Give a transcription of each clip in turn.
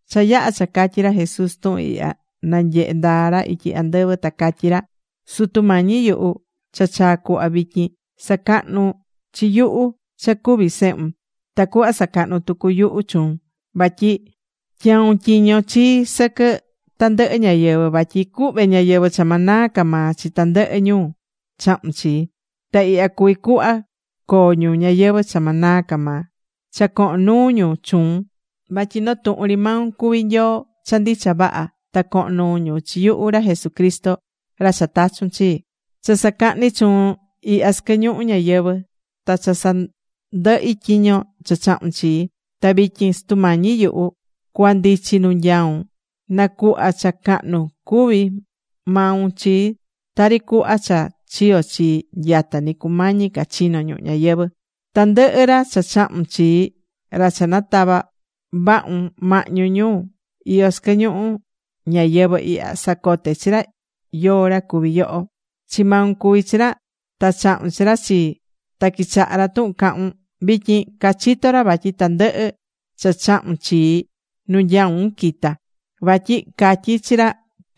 Cha yaha̱ cha catyi ra Jesús tuhun ihya, nanyehe̱ ndaa ra ityi andɨvɨ ta catyí ra: ―Sutu Mañi yuhu, cha chaa̱ cuhva vityin. Sa̱cahnu chi yuhu cha cuví sehun, tacuhva sacahnu tucu yuhu chuun. Vatyi tyau̱n tyiño chii sɨquɨ tandɨhɨ ñáyɨvɨ, vatyi cuhve ñayɨvɨ̱ cha ma naa ca maa chi tandɨhɨ ñu chahu̱n chii. Ta ihya cuví cuhva coo ñu ñayɨvɨ̱ cha ma naa ca maa: Cha cohon nuu ñu chuun vatyi noo tuhun ri maun cuví Nyoo cha ndicha vaha, ta cohon nuu ñu chi yuhu ra Jesucristo ra cha tachu̱n chi. ’Cha sacahni̱ chuun ihya sɨquɨ ñuhu ñayɨvɨ̱ ta cha sandɨhi̱ tyiño cha chahu̱n chii. Ta vityin, Sutu Mañi yuhu, cua ndichi nu nyaun, na̱cuhva cha cahnun cuví maun chii, tari cuhva cha chiyo chii nyata ni cumañi ca chino ñuhu ñayɨvɨ̱. ’Tandɨhɨ ra cha chahu̱n chii ra cha natava̱ vahun mahñu ñu iyó sɨquɨ ñuhu ñayɨvɨ̱ ihya sacote̱ chi ra yóó ra cuví yoho. Chi maun cuví chi ra ta chahu̱n chi ra chii. Ta quichahá ra tuhun cahún. Vityin cachitó ra vatyi tandɨhɨ cha chahu̱n chii, nu nyaún quita̱. Vatyi catyi̱ chi ra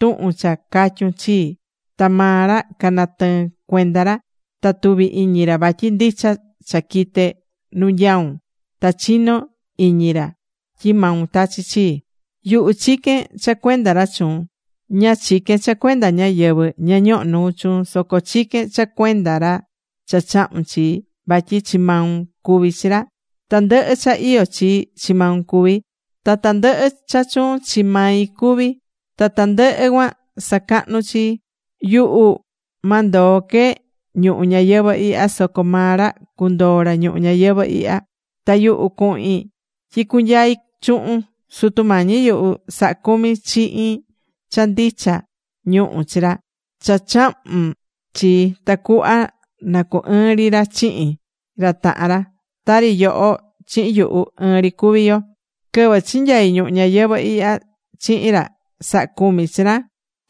tuhun cha catyu̱n chii, ta maa ra canatɨɨ̱n cuenda ra. Ta tuvi̱ iñi ra vatyi ndicha cha quite̱ nu nyaún, ta chinó iñi ra tyi maun tachi̱ chii. ’Yuhu chiquén cha cuenda ra chuun. Ña chiquén cha cuenda ñáyɨvɨ ña ñohó nuu chuun, soco chiquén cha cuenda ra cha chahu̱n chii, vatyi chi maun cuví chi ra. Tandɨhɨ cha iyó chii, chi maun cuví. Ta tandɨhɨ cha chuun, chi mai cuví. Ta tandɨhɨ cuan sacahnú chii. ’Yuhu ma ndoo que ñuhu ñayɨvɨ̱ ihya, soco maa ra cundoo ra ñuhu ñayɨvɨ̱ ihya. Ta yuhu cuhin tyi cunyai chuhun. Sutu Mañi yuhu, sa̱ha cumi chihin cha ndicha ñuhu chi ra cha chahu̱n chii, tacuhva na cu ɨɨn ri ra chihin ra tahan ra, tari yoho chihin yuhu, ɨɨn ri cuví yo. Quɨvɨ chinyai ñuhu ñayɨvɨ̱ ihya chihin ra, saha̱ cumi chi ra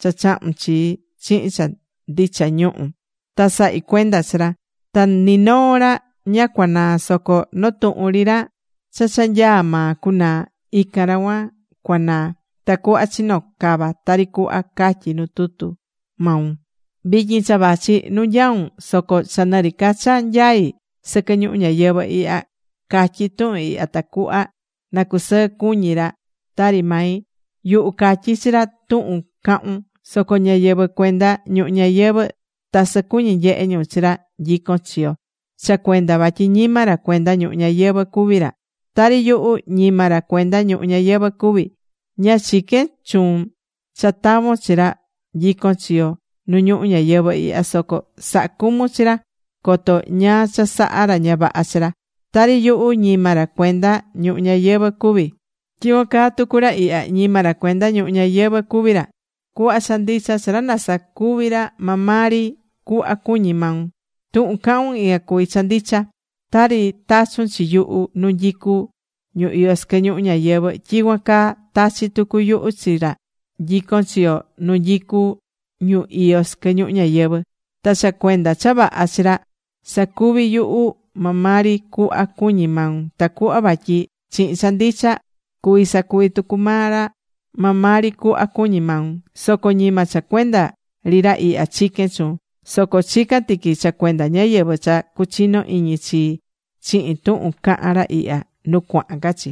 cha chahu̱n chii chihin cha ndicha ñuhun. Ta sahi̱ cuenda chi ra. Ta ni noo ra ña cuanaa̱ soco noo tuhun ri ra cha cha nyaá maa cunaa, ican ra cuan cunaa, tacuhva chino cava tari cuhva catyí nu tutu maun. ’Vityin cha vachi nu nyaún, soco cha nɨ ri ca cha nyaí sɨquɨ ñuhu ñayɨvɨ̱ ihya, catyí tuhun ihya tacuhva na cusɨɨ cuñi ra tari mai. Yuhu catyi̱ chi ra tuhun cahún, soco ñáyɨvɨ cuenda ñuhu ñayɨvɨ̱ tasɨ cuñí nyehe ñu chi ra nyicón chi yo, cha cuenda vatyi ñima ra cuenda ñuhu ñayɨvɨ̱ cuví ra, tari yuhu, ñima ra cuenda ñuhu ñayɨvɨ̱ cuví. Ña chiquén chuun cha tavon chi ra nyicón chi yo nu ñuhu ñayɨvɨ̱ ihya, soco sa̱ha cumun chi ra coto ñáá cha saha ra ña vaha chi ra. Tari yuhu ñima ra cuenda ñuhu ñayɨvɨ̱ cuví, tyicuan caa tucu ra ihya, ñima ra cuenda ñuhu ñayɨvɨ̱ cuví ra. Cu̱hva cha ndicha chi ra nasacuvi ra maa maa ri cuhva cuñí maun. Tuhun cahún, ican cuví cha ndicha. Tari tachu̱n chi yuhu nu nyicú ñu iyó sɨquɨ ñuhu ñayɨvɨ̱, tyicuan caa tachi̱ tucu yuhu chi maa ra nyicón chi yo nu nyicú ñu iyó sɨquɨ ñuhu ñayɨvɨ̱. Ta cha cuenda cha vaha chi ra, sacuví yuhu maa maa ri cuhva cuñí maun, tacuhva vatyi chihin cha ndicha, cuví sacuvi tucu maa ra maa maa ri cuhva cuñí maun. ’Soco ñima cha cuenda ri ra ihya chiquén chuun, soco chicán tiqui cha cuenda ñáyɨvɨ cha cuchino iñi chii chihin tuhun cahán ra ihya nu cuahan ca chi.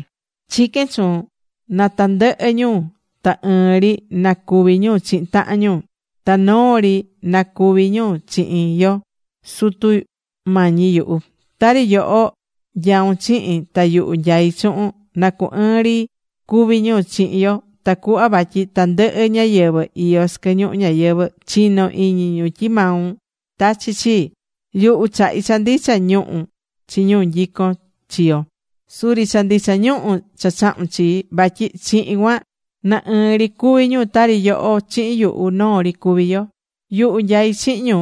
Chiquén chuun na tandɨhɨ ñu ta ɨɨn ri na cuvi ñu chihin tahan ñu. Ta noo ri na cuvi ñu chihin yo, Sutu Mañi yuhu. Tari yoho nyaún chihin ta yuhu nyaí chuhun, na cu ɨɨn ri cuví ñu chihin yo, tacuhva vatyi tandɨhɨ ñáyɨvɨ iyó sɨquɨ ñuhu ñayɨvɨ̱ chino iñi ñu tyi maun tachi̱ chii. Yuhu chahi̱ cha ndicha ñuhu chi ñu nyicón chi yo, suri cha ndicha ñuhu cha chahu̱n chii. Vatyi chihin cuan na ɨɨn ri cuví ñu tari yoho chihin yuhu noo ri cuví yo. Yuhu nyaí chihin ñu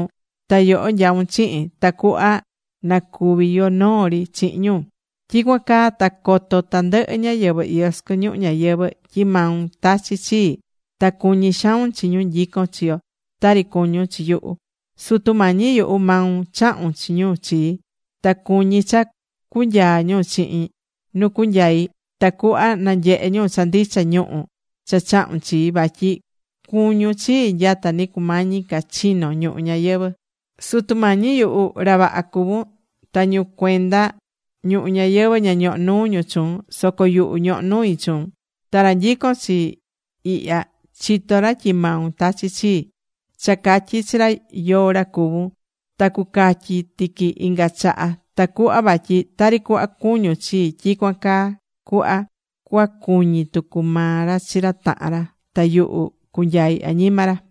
ta yoho nyaún chihin, tacuhva na cuvi yo noo ri chihin ñu. Tyicuan caa ta coto tandɨhɨ ñáyɨvɨ iyó sɨquɨ ñuhu ñayɨvɨ̱ tyi maun tachi̱ chii, ta cuñí xaun chi ñu nyicón chi yo tari cuñún chi yuhu. ’Sutu Mañi yuhu, maun chahu̱n chi ñu chii. Ta cuñí cha cunyaa ñu chihin nu cuacunyai, tacuhva nanyehe ñu cha ndicha ñuhu cha chahu̱n chii vatyi cuñún chii nyata ni cumañi ca chino ñuhu ñayɨvɨ̱. Sutu Mañi yuhu, ra vaha cuvún, ta ñu cuenda ñuhu ñayɨvɨ̱ ña ñohó nuu ñu chuun, soco yuhu ñohó nui chuun. Ta ra nyicón chi yo ihya chitó ra tyi maun tachi̱ chii. Cha catyi̱ chi ra yóó ra cuvún, ta cucatyi tiqui inga chaha, tacuhva vatyi tari cuhva cuñún chii, tyicuan caa cuhva cuacuñi tucu maa ra chi ra tahan ra. Ta yuhu cunyai añima ra.